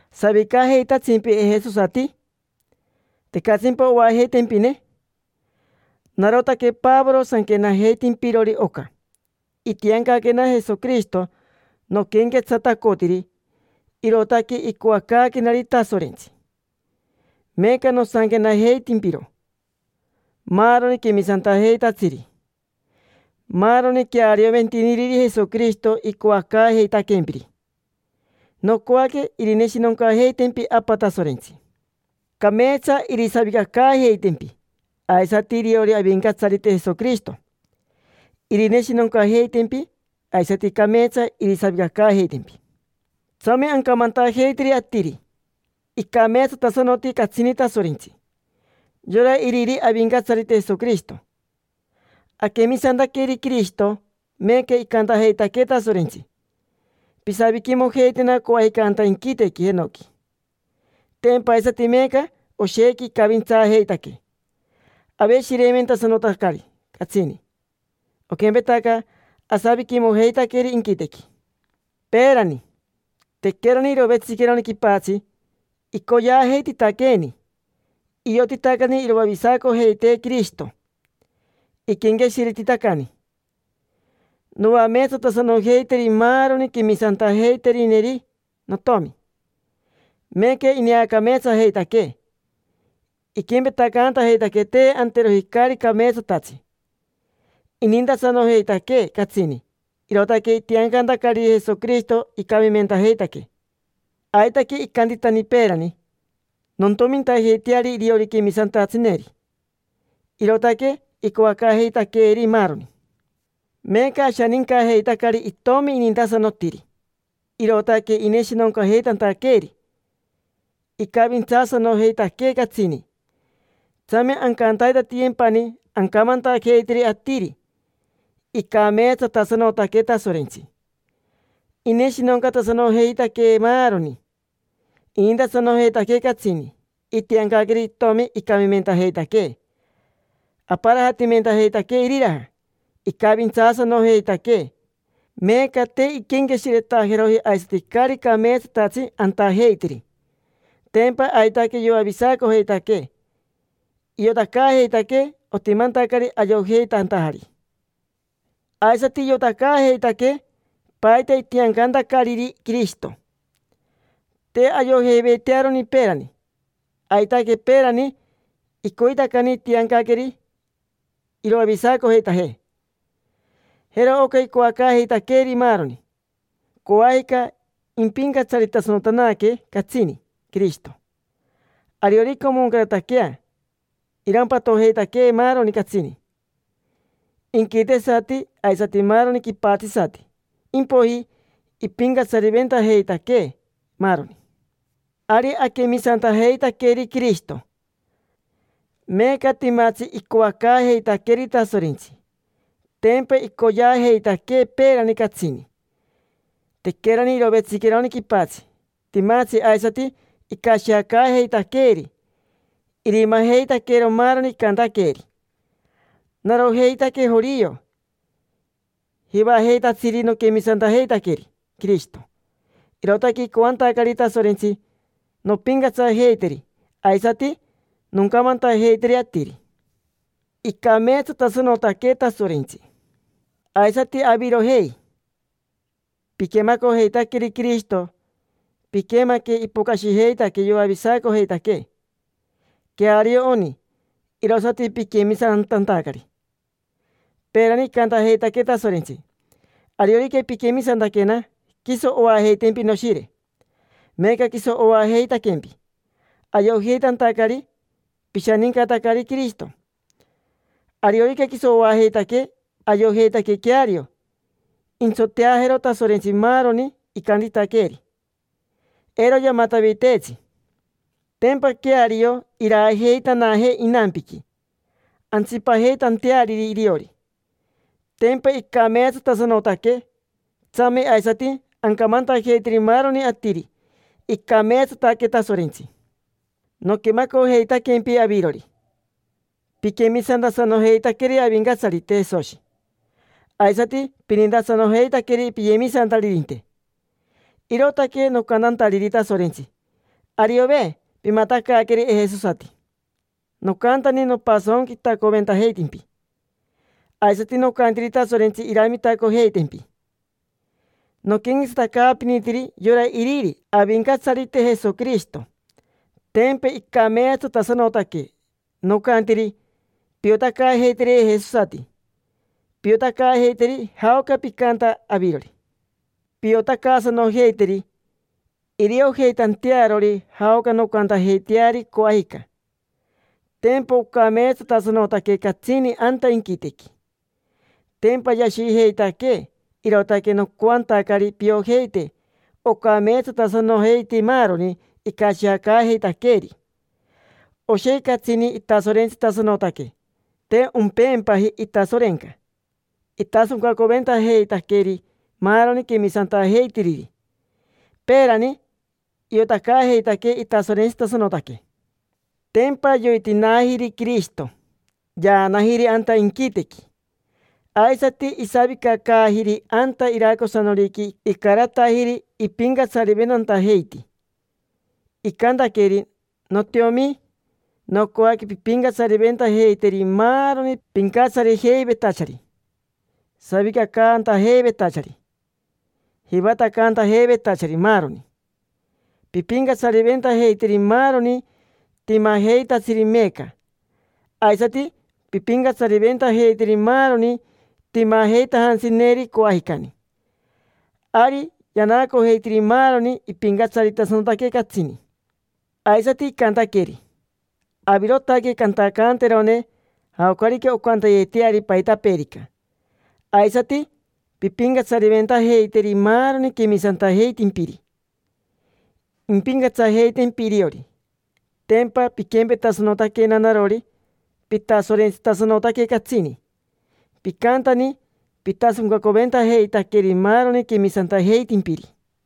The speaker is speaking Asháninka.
¿Savicajeitatsimpi, ejesosati? ¿Tecatsimpa oajeitempine? Narotaque Pavoro sanquenajeitimpirori oca. Itiancaquena Jesoquirishito noquenquetsatacotiri, irootaque icoacaaquenari Tasorentsi. Meeca nosanquenajeitimpiro maaroni quemisantajeitatsiri, maaroni quearioventiniriri Jesoquirishito icoacaajeitaquempiri. Nocoaque irineshinoncajeitempi Apa Tasorentsi, cameetsa irisavicacaajeitempi. Aisati iriori Avincatsarite Jesoquirishito: irineshinoncajeitempi, aisati cameetsa irisavicacaajeitempi. Tsame ancamantajeiteri atiri icameetsatasanoti catsini Tasorentsi: yora iriri Avincatsarite Jesoquirishito. Aquemisantaqueri Quirishito, meeca icantajeitaquee Tasorentsi: “Pisaviquimojeitena coajica anta inquitequi jenoqui”. Tempa aisati meeca oshequi icavintsaajeitaquee, aveshireimentasanotacari catsini, oquempetaca asaviquimojeitaqueri inquitequi. Peerani, tequerani irovetsiqueroni quipatsi, icoyeajeititaqueeni, iotitacani iroavisacojeitee Quirishito. Iquenqueshiretitacani: “Noameetsatasanojeiteri maaroni quemisantajeiterineri notomi”. Meeca ineacameetsajeitaquee, iquempetacantajeitaquee te anteroji caari cameetsatatsi. Inintasanojeitaquee catsini, irootaque itiancantacariri Jesoquirishito icamimentajeitaquee. Aitaque icantitani peerani: “Nontomintajeiteari iriori quemisantatsineri”. Irootaque icoacaajeitaqueeri maaroni. Meeca ashanincajeitacari Itomi inintasanotiri, irootaque ineshinoncajeitantaqueeri. Icavintsaasanojeitaquee catsini. Tsame ancantaitatiyempani ancamantajeiteri atiri: “Icameetsatasanotaque Tasorentsi”. Ineshinoncatasanojeitaquee maaroni, inintasanojeitaquee catsini. Itiancaqueri Itomi icamimentajeitaquee, aparajatimentajeitaquee iriraja. Icavintsaasanojeitaquee, meeca te inquenqueshiretajeroji aisati caari cameetsatatsi antajeitiri. Tempa aitaque yoavisacojeitaquee. Iotacaajeitaquee, otimantacari ayojeitantajari. Aisati iotacaajeitaquee paita itiancantacariri Quirishito: te ayojeiveitearoni peerani. Aitaque, peerani icoitacani intianqueri iroavisacojeitajee. Jero oca icoacaajeitaqueeri maaroni: coajica impincatsaritasanotanaque catsini Quirishito. Ariorica omoncarataquea, irampatojeitaquee maaroni catsini: inquitesati aisati maaroni quipatsisati. Impoiji impincatsariventajeitaquee, maaroni. Ari aquemisantajeitaqueri Quirishito, meeca timatsi icoacaajeitaqueeri Tasorentsi. Tempa icoyeajeitaquee peerani, catsini: tequerani irovetsiqueroni quipatsi. Timatsi aisati icashiacaajeitaqueeri: irimajeitaqueero maaroni icantaqueeri. Narojeitaque jorio jivajeitatsiri noquemisantajeitaqueri Quirishito, irootaque icoantacari Tasorentsi nompincatsajeiteri, aisati noncamantajeiteri atiri: “Icameetsatasanotaque Tasorentsi”. Aisati avirojei: piquemacojeitaqueri Quirishito. Piquemaque ipocashijeitaquee yoavisacojeitaquee. Queario oni, irosati piquemisantantacari. Peerani icantajeitaquee Tasorentsi: “Ariorica pinquemisantaquena, quiso oajeitempi Noshire”. Meeca quiso oajeitaquempi, ayojeitantacari pishanincatacari Quirishito. Ariorica quiso oajeitaquee, ayojeitaque queario, intsoteajeero Tasorentsi maaroni icantitaqueeri. Eiro yamataviteetsi. Tempa queario iraajeitanajee inampiqui antsipajeitanteariri iriori. Tempa icameetsatasanotaque. Tsame aisati ancamantajeiteri maaroni atiri: “Icameetsataque Tasorentsi”. Noquemacojeitaquempi avirori, piquemisantasanojeitaqueri Avincatsarite Jesoshi, aisati pinintasanojeitaqueri piyemisantaririnte. Irootaque nocantantariri Tasorentsi: “Ariove pimatacaaqueri ejesosati”. Nocantani nopasonquitacoventajeitimpi, aisati nocantiri Tasorentsi iramitacojeitempi. Noquenquetsatacaapinitiri yora iriri Avincatsarite Jesoquirishito: tempa icameetsatasanotaque. Nocantiri: “Piotacaajeiteri ejesosati, piotacaajeiteri jaoca picanta avirori. Piotacaasanojeiteri, iriojeitantearori jaoca noncantajeiteari, coajica: tempa ocameetsatasanotaque catsini anta inquitequi”. Tempa yashijeitaquee, irootaque nocoantacari piojeite ocameetsatasanojeiti maaroni icashiacaajeitaqueeri. Oshequi catsini itasorentsitasanotaque, te ompeempaji itasorenca. Itasoncaventajeitaqueri maaroni quemisantajeitiriri. Peerani iotacaajeitaquee itasorentsitasanotaque, tempa yoitinaajiri Quirishito. Yaanajiri anta inquitequi, aisati isavicacaajiri anta iracosanoriqui icaratajiri ipincatsariventantajeiti. Icantaqueri: “Notiomi, nocoaque pimpincatsariventajeiteri maaroni pincatsarijeivetachari, savicacantajeivetachari, jivatacaantajeivetachari, maaroni. Pimpincatsariventajeiteri maaroni timajeitatsiri meeca, aisati pimpincatsariventajeiteri maaroni timajeitajantsineri coajicani”. Ari yanaacojeitiri maaroni, ipincatsaritasanotaque catsini. Aisati icantaqueri: “Avirotaque cantacanterone jaocarica oncantayeteari paitapeerica, aisati pimpincatsariventajeiteri maaroni quemisantajeitimpiri. Impincatsajeitempi iriori. Tempa piquempetasanotaquena narori, pitasorentsitasanotaque catsini, picantani pitasoncacoventajeitaqueri maaroni quemisantajeitimpiri”.